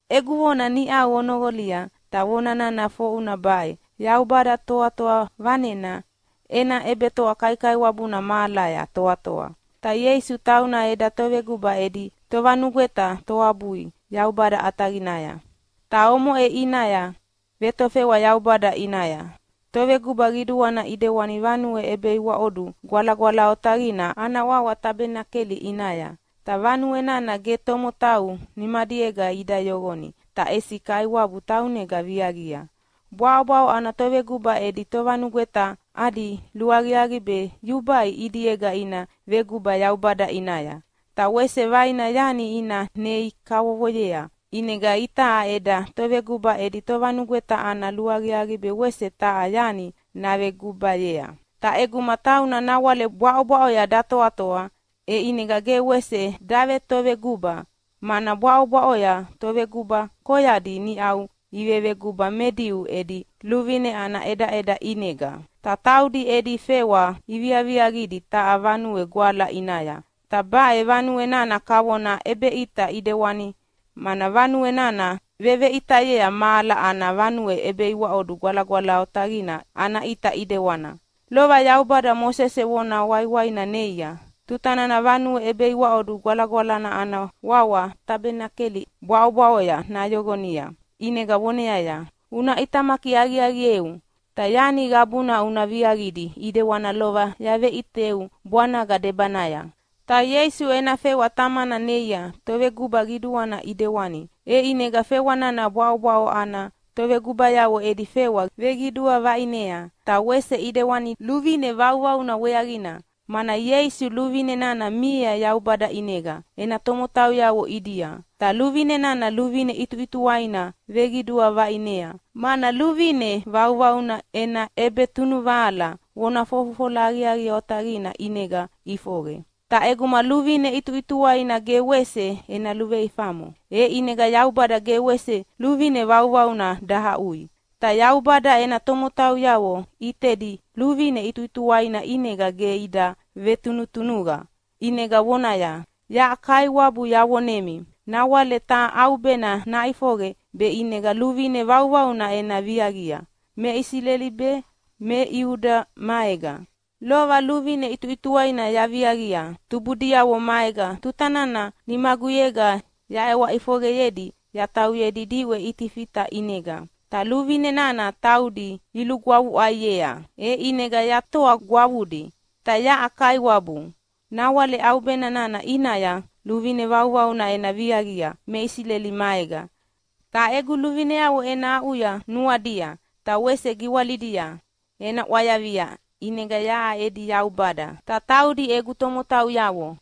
Egu vona niʼau onoqolia, ta vona nana foʼuna baʼe: Yaubada Toatoa Vanena ena ʼebetoa kaikaiwabuna mahalaya toatoa, ta Ieisu tauna eda Toveguba edi Tovanugweta toabui Yaubada ʼataqinaya. Ta omoʼe ʼinaya vetofewa Yaubada ʼinaya Toveguba Qiduana ʼidewani vanue ʼebeiwaʼodu gwalagwala otaqina ana wawa Tabenakeli ʼinaya. Ta vanue nana ge tomotau nimadiega ida yoqoni, ta ʼesi Kaiwabu taunega viaqia. Bwaʼobwaʼo ana toveguba edi tovanugweta adi luaqiaqi be yubai ʼidiega ina veguba Yaubada ʼinaya, ta wese vaina yani ina nei kavovoyea. ʼInega itaʼa eda Toveguba edi Tovanugweta ana luaqiaqi be wese taha yani navegubayea. Ta ʼeguma tauna nawale bwaʼobwaʼoya datoatoa, e ʼinega ge wese davetoveguba, mana bwaʼobwaʼoya toveguba koyadi niʼau iveveguba me Diu edi luvine ana ʼedaʼeda ʼinega. Ta taudi edi fewa iviaviaqidi taha vanue gwala ʼinaya, ta baʼe vanue nana kavona ʼebeʼita ʼidewani, mana vanue nana veveʼitayea mahala ana vanue ʼebeiwaʼodu gwalagwala otaqina ana ʼita ʼidewani. Lova Yaubada Mosese vona waiwaina neia tuta nana vanue ʼebeiwaʼodu gwalagwalana ana wawa Tabenakeli bwaʼobwaʼoya nayoqonia, ʼinega voneaya, “Una ʼitamaki aqiaqieu, ta yani qabuna una viaqidi ʼidewani lova yaveʼiteu bwanaga debanaya.” Ta Ieisu ena fewa Tamana neia Toveguba Qiduana ʼidewani, e ʼinega fewa nana bwaʼobwaʼo ana tovegubayavo edi fewa veqidua vaʼinea. Ta wese ʼidewani luvine vauvauna weaqina, mana Ieisu luvine nana miea Yaubada ʼinega ena tomotauyavo ʼidia, ta luvine nana luvine ʼituʼituwaina veqidua vaʼinea, mana luvine vauvauna ena ʼebetunuvahala vona fofofola aqiaqi otaqina ʼinega ʼifoqe. Ta ʼeguma luvine ʼituʼituwaina ge wese ena luveifamo, e ʼinega Yaubada ge wese luvine vauvauna dahaʼui. Ta Yaubada ena tomotauyavo ʼitedi luvine ʼituʼituwaina ʼinega ge ida vetunutunuqa, ʼinega vonaya, “Yaʼa Kaiwabu yavonemi nawale taha ʼaubena naʼifoqe be ʼinega luvine vauvauna ena viaqia me Isileli be me Iuda maega. Lova luvine ʼituʼituwaina yaviaqia tubudiavo maega tuta nana nimaguyega yaʼewa ʼifoqeyedi yatauyedi diʼwe Itifita ʼinega. Ta luvine nana taudi ilugwavuʼaiea, e ʼinega yatoa gwavudi. Ta yaʼa Kaiwabu, nawale ʼaubena nana ʼinaya luvine vauvauna ena viaqia me Isileli maega. Ta egu luvineavo ena aʼuya nuadia, ta wese giwalidia ena ʼwayavia. ʼInega yaʼa edi Yaubada, ta taudi egu tomotauyavo.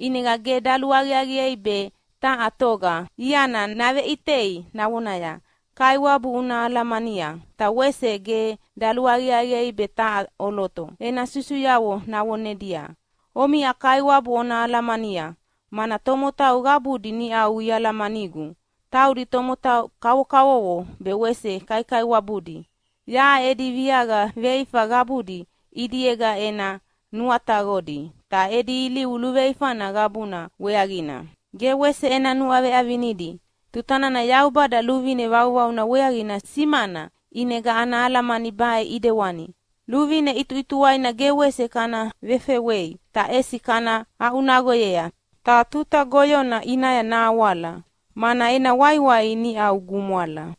ʼInega ge daluaqiaqiei be taha toga iana naveʼitei navonaya, ‘Kaiwabu una alamania!’ Ta wese ge daluaqiaqi be taha ʼoloto ena susuyavo navonedia, ‘Omiʼa Kaiwabu ona alamania!’ mana tomotau qabudi niʼau ialamanigu, taudi tomotau kavokavovo be wese kaikaiwabudi. Yaʼa edi viaqa veifa qabudi ʼidiega ena nuataqodi, ta edi ilivu luveifana qabuna weaqina ge wese ena nuaveʼavinidi.” Tuta nana Yaubada luvine vauvauna weaqina simana ʼinega ana alamani baʼe ʼidewani: Luvine ʼituʼituwaina ge wese kana vefewei, ta ʼesi kana aʼunaqoyea ta tuta goyona ʼinaya nahawala, mana ena waiwai niʼau gumwala.